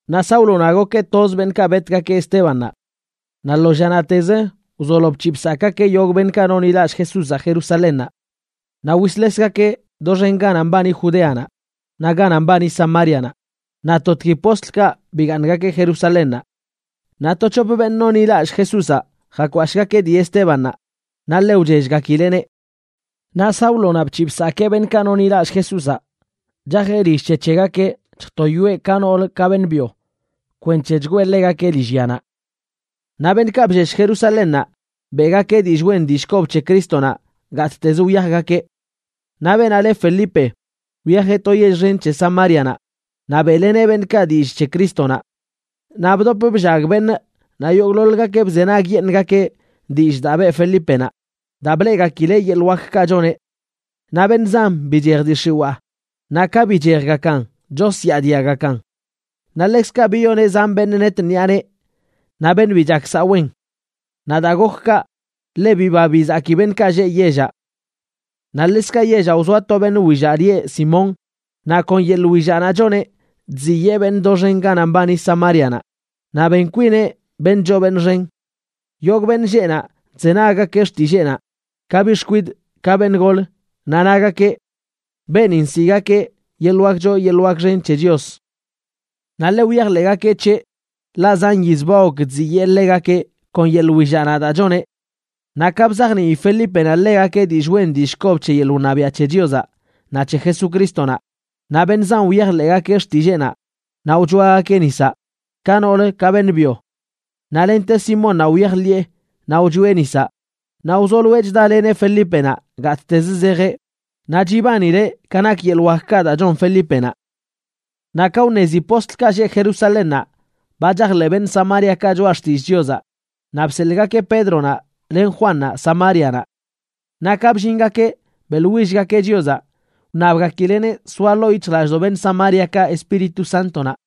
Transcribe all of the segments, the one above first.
Naꞌ Sáulonaꞌ gokeꞌ toz beṉꞌkaꞌ betgakeꞌ Estébannaꞌ. Naꞌ lo llanaꞌtez wzolo bc̱hiꞌ bsakꞌgakeꞌ yogꞌ beṉꞌkaꞌ nonḻilallꞌ Jesúzaꞌ Jerusalénnaꞌ. Naꞌ wisḻesgakeꞌ doxen ganaꞌ mbani Judeanaꞌ naꞌ ganaꞌ mbani Samárianaꞌ, naꞌ totgui postlkaꞌ bigaaṉgakeꞌ Jerusalénnaꞌ. Naꞌ to c̱hop beṉꞌ nonḻilallꞌ Jesúzaꞌ jakwashꞌgakeꞌ dii Estébannaꞌ naꞌ ḻe wchellgakileꞌneꞌ. Naꞌ Sáulonaꞌ bc̱hiꞌ bsakee beṉꞌkaꞌ nonḻilallꞌ Jesúzaꞌ, chajeꞌ lill c̱he c̱hegakeꞌ chjtoyoeꞌ ka nool ka beṉꞌ byo kwenc̱he chgwee ḻegakeꞌ lillyanaꞌ. Naꞌ beṉꞌkaꞌ bllesh Jerusalénnaꞌ beꞌgakeꞌ dillꞌ wen dillꞌ kob c̱he Crístonaꞌ gattezə wyajgakeꞌ. Naꞌ beenaꞌ le Felipe, wyajeꞌ to yell xen c̱he Samárianaꞌ naꞌ beꞌleneꞌ beṉꞌkaꞌ dillꞌ c̱he Crístonaꞌ. Naꞌ bdop bllag beṉꞌ, naꞌ yogꞌḻoḻgakeꞌ bzenagyeṉꞌgakeꞌ dillꞌ daa beꞌ Felípenaꞌ, daa bleꞌgakileꞌ yeḻꞌ wakkaꞌ choneꞌ. Naꞌ beṉꞌ zan bichej dii x̱iwaa, naꞌ ka bichejgakan chosyaadiagakan. Naꞌ ḻekzkaꞌ biyoneꞌ zan beṉꞌ net ṉiꞌa nee, naꞌ beṉꞌ bi chak saꞌ wen. Naꞌ daa gok kaꞌ, ḻe biba bizaki beṉꞌkaꞌ lleꞌ yellaꞌ. Naꞌ ḻekzkaꞌ yellaꞌ wzoa to beṉꞌ willaꞌ lieꞌ Simón, naꞌ kon yeḻꞌ willaꞌnaꞌ choneꞌ chziyee beṉꞌ doxen ganaꞌ mbani Samárianaꞌ, naꞌ ben kwineꞌ beṉꞌ choo beṉꞌ xen. Yogꞌ beṉꞌ lleꞌ naꞌ chzenaggakeꞌ xtilleenaꞌ, ka biꞌ xkwidꞌ ka beṉꞌ gol, naꞌ nagakeꞌ: ―Beenin nsiꞌgakeꞌ Yeḻꞌ Wak Choo Yeḻꞌ Wak Xen c̱he Chios. Naꞌ ḻe wyajḻeꞌgakeꞌ c̱heꞌ, ḻaꞌ zan yiz ba gok chziyee ḻegakeꞌ kon yeḻꞌ willaꞌnaꞌ daa choneꞌ. Naꞌ ka bzajnii Felípenaꞌ ḻegakeꞌ dillꞌ wen dillꞌ kob c̱he yeḻꞌ wṉabiaꞌ c̱he Chiozaꞌ naꞌ c̱he Jesucrístonaꞌ, naꞌ beṉꞌ zan wyajḻeꞌgakeꞌ xtilleenaꞌ naꞌ wchoagakeꞌ nisaꞌ, ka noolə ka beṉꞌ byo. Naꞌ lente Simónnaꞌ wyajḻiꞌe naꞌ wchoeꞌ nisaꞌ, naꞌ wzoloeꞌ chdaleneꞌ Felípenaꞌ gattez zejeꞌ, naꞌ chibanileꞌ ka nak yeḻꞌ wakkaꞌ daa chon Felípenaꞌ. Naꞌ ka wṉezi postlkaꞌ lleꞌ Jerusalénnaꞌ ba chajḻeꞌ beṉꞌ Samáriakaꞌ choꞌa xtillꞌ Chiozaꞌ, naꞌ bselꞌgakeꞌ Pédronaꞌ len Juannaꞌ Samárianaꞌ. Naꞌ ka bllingakeꞌ, beꞌḻwillgakeꞌ Chiozaꞌ wṉabgakileꞌneꞌ soa ḻoo yic̱hjlallꞌdoꞌ beṉꞌ Samáriakaꞌ Espíritu Sántonaꞌ.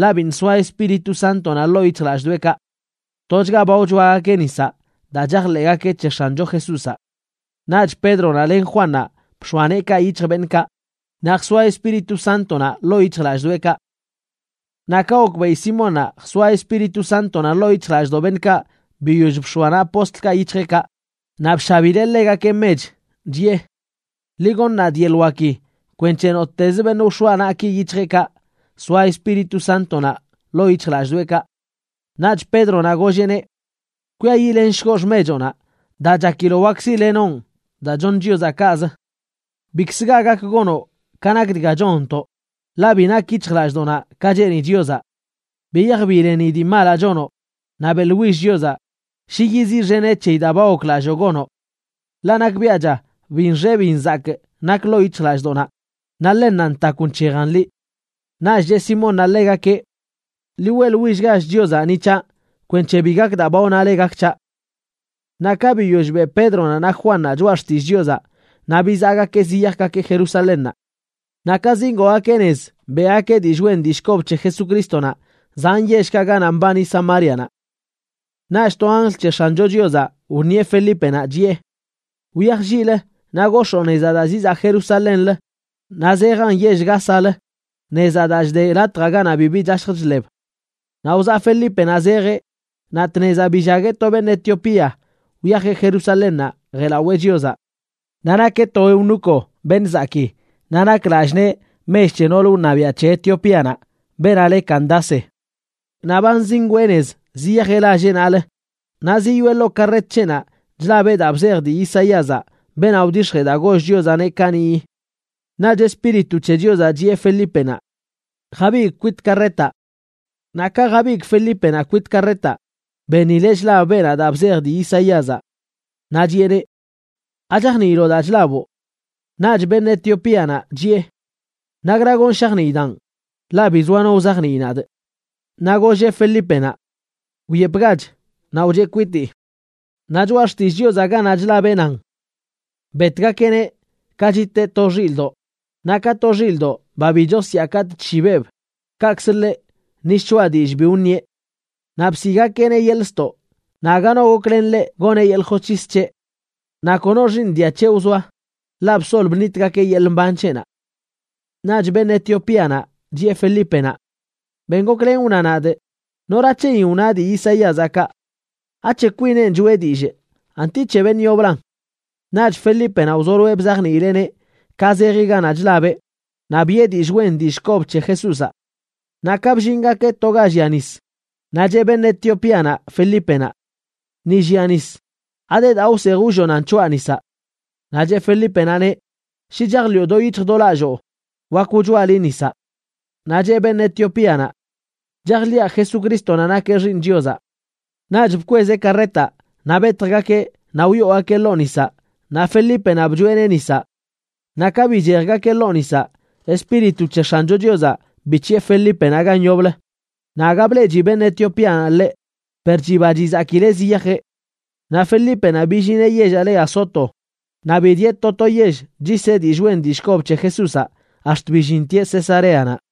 Ḻaꞌ biṉꞌ soaꞌ Espíritu Sántonaꞌ ḻoo yic̱hjlallꞌdoꞌekaꞌ. Tochga ba wchoagakeꞌ nisaꞌ daa chajḻeꞌgakeꞌ c̱he X̱ancho Jesúzaꞌ. Naꞌch Pédronaꞌ len Juannaꞌ bx̱oa neekaꞌ yic̱hj beṉꞌkaꞌ, naꞌ jsoa Espíritu Sántonaꞌ ḻoo yic̱hjlallꞌdoꞌekaꞌ. Naꞌ ka gokbeꞌi Simónnaꞌ jsoa Espíritu Sántonaꞌ ḻoo yic̱hjlallꞌdoꞌ beṉꞌkaꞌ biyoll bx̱oa naꞌ postlkaꞌ yic̱hjeꞌkaꞌ, naꞌ bshabileꞌ ḻegakeꞌ mech, chiꞌe: ―Ḻi goṉ nadꞌ yeḻꞌ waki kwenc̱he nottez beṉꞌ ka wx̱oaꞌ naꞌki yic̱hjeꞌkaꞌ soa Espíritu Sántonaꞌ ḻoo yic̱hjlallꞌdoꞌekaꞌ. Naꞌch Pédronaꞌ golleꞌneꞌ: ―Kwiayiꞌlenshgoꞌ xmechoꞌnaꞌ, daa chakiloꞌ wak siꞌlenoꞌn daa choṉ Chiozaꞌ kaꞌz. Bikz ga gak gonoꞌ ka nak dga chonntoꞌ, ḻaꞌ bi nak yic̱hjlallꞌdoꞌnaꞌ ka cheeni Chiozaꞌ. Biyaj bileni dii malaꞌ chonoꞌ, naꞌ beꞌḻwill Chiozaꞌ shi yiziꞌxeneꞌ c̱heyi daa ba goklalloo gonoꞌ. Ḻaꞌ nakbiaꞌcha bin nxe bin nzakꞌ nak ḻoo yic̱hjlallꞌdoꞌnaꞌ, naꞌ ḻennanꞌ ntakw nc̱hejan liꞌ. Naꞌch cheꞌ Simónnaꞌ ḻegakeꞌ: ―Ḻi weꞌḻwillgach Chiozaꞌ ni c̱haꞌ kwenc̱he bi gak daa ba wnale gak c̱haꞌ. Naꞌ ka biyoll beꞌ Pédronaꞌ naꞌ Juannaꞌ choꞌa xtillꞌ Chiozaꞌ, naꞌ bizaꞌgakeꞌ ziyajgakeꞌ Jerusalénnaꞌ. Naꞌ ka zingoogakeꞌ nez, beꞌgakeꞌ dillꞌ wen dillꞌ kob c̱he Jesucrístonaꞌ zan yellkaꞌ ganaꞌ mbani Samárianaꞌ. Naꞌch to anjl c̱he X̱ancho Chiozaꞌ wṉieꞌ Felípenaꞌ, chiꞌe: ―Wyaj lliꞌlə naꞌ gox̱oo nezaꞌ daa zizaꞌ Jerusalénlə naꞌ zejan yell Gázalə, nezaꞌ daa chde latjaꞌ ganaꞌ bibi chashj chḻeb. Naꞌ wzaꞌ Felípenaꞌ zejeꞌ, naꞌ tnezaꞌ billagueꞌ to beṉꞌ Etiopía wyajeꞌ Jerusalénnaꞌ jeꞌlawee Chiozaꞌ. Naꞌ nakeꞌ to eunuco,a beṉꞌ zakii, naꞌ nak lallꞌ nee mech c̱he noolə wṉabiaꞌ c̱he Etiopíanaꞌ beenaꞌ le Candace. Naꞌ ba zingwee nez ziyajeꞌ lalleꞌnalə, naꞌ ziyoꞌe ḻoo karret c̱heꞌnaꞌ chlabeꞌ daa bzej dii Isaíazaꞌ, beenaꞌ wdix̱jee daa goll Chiozaꞌneꞌ kaniꞌyi. Naꞌch Espíritu c̱he Chiozaꞌ chiꞌe Felípenaꞌ: ―Jabigꞌ kwit karretaꞌ. Naꞌ ka jabigꞌ Felípenaꞌ kwit karretaꞌ, benileꞌ chlab beenaꞌ daa bzej dii Isaíazaꞌ. Naꞌ chiꞌeneꞌ: ―¿Achajniiloꞌ daa chlaboꞌ? Naꞌch beṉꞌ Etiopíanaꞌ chiꞌe: ―¿Nakra gonꞌ shajniidaꞌn?, ḻaꞌ bi zoa no wzajnii nadꞌ. Naꞌ golleꞌ Felípenaꞌ: ―Wyepgach naꞌ wcheꞌ kwitii. Naꞌ Choꞌa Xtillꞌ Chiozaꞌ ganaꞌ chlabeꞌ nan: Betgakeꞌneꞌ ka chiteꞌ to xilꞌdoꞌ; naꞌ ka to xilꞌdoꞌ, ba bi chosyaa katꞌ chshibeꞌb, kaꞌkz ḻeꞌ, ni shchoꞌa dillꞌ bi wṉieꞌ. Naꞌ bsiꞌgakeꞌneꞌ yeḻꞌ ztoꞌ, naꞌ aga no goklen ḻeꞌ goneꞌ yeḻꞌ josc̱his c̱heꞌ. Naꞌ kono xiiṉ dia c̱he wzoa, ḻaꞌ bsol bṉitgakeꞌ yeḻꞌ mban c̱heꞌnaꞌ. Naꞌch beṉꞌ Etiopíanaꞌ chiꞌe Felípenaꞌ: ―Ben goklen wna nadꞌ, ¿nora c̱heyin wna dii Isaíazaꞌ kaꞌ? ¿Ac̱he kwinenꞌ choꞌe dillꞌ, anti c̱he beṉꞌ yoblan? Naꞌch Felípenaꞌ wzoloeꞌ bzajniileꞌneꞌ ka zeji ganaꞌ chlabeꞌ naꞌ biꞌe dillꞌ wen dillꞌ kob c̱he Jesúzaꞌ. Naꞌ ka bllingakeꞌ to ga llia nis, naꞌ cheꞌ beṉꞌ Etiopíanaꞌ Felípenaꞌ: ―Ni llia nis, ¿ade daa wsej wllonan c̱hoaꞌ nisaꞌ? Naꞌ cheꞌ Felípenaꞌneꞌ: ―Shi chajḻiꞌo do yic̱hj do lalloo, wak wchoaꞌ liꞌ nisaꞌ. Naꞌ cheꞌ beṉꞌ Etiopíanaꞌ: ―Chajḻiꞌa Jesucrístonaꞌ nakeꞌ Xiiṉ Chiozaꞌ. Naꞌch bkwezeꞌ karretaꞌ naꞌ betjgakeꞌ; naꞌ wyoogakeꞌ ḻoo nisaꞌ naꞌ Felípenaꞌ bchoeꞌneꞌ nisaꞌ. Naꞌ ka bichejgakeꞌ ḻoo nisaꞌ, Espíritu c̱he X̱ancho Chiozaꞌ bic̱hiꞌe Felípenaꞌ gan yoblə, naꞌ aga bleꞌchi beṉꞌ Etiopíanaꞌ ḻeꞌ, per chiba chizakileꞌ ziyajeꞌ. Naꞌ Felípenaꞌ billineꞌ yellaꞌ le Azoto, naꞌ bidieꞌ to to yell chyiseꞌ dillꞌ wen dillꞌ kob c̱he Jesúzaꞌ ax̱t billintieꞌ Cesareanaꞌ.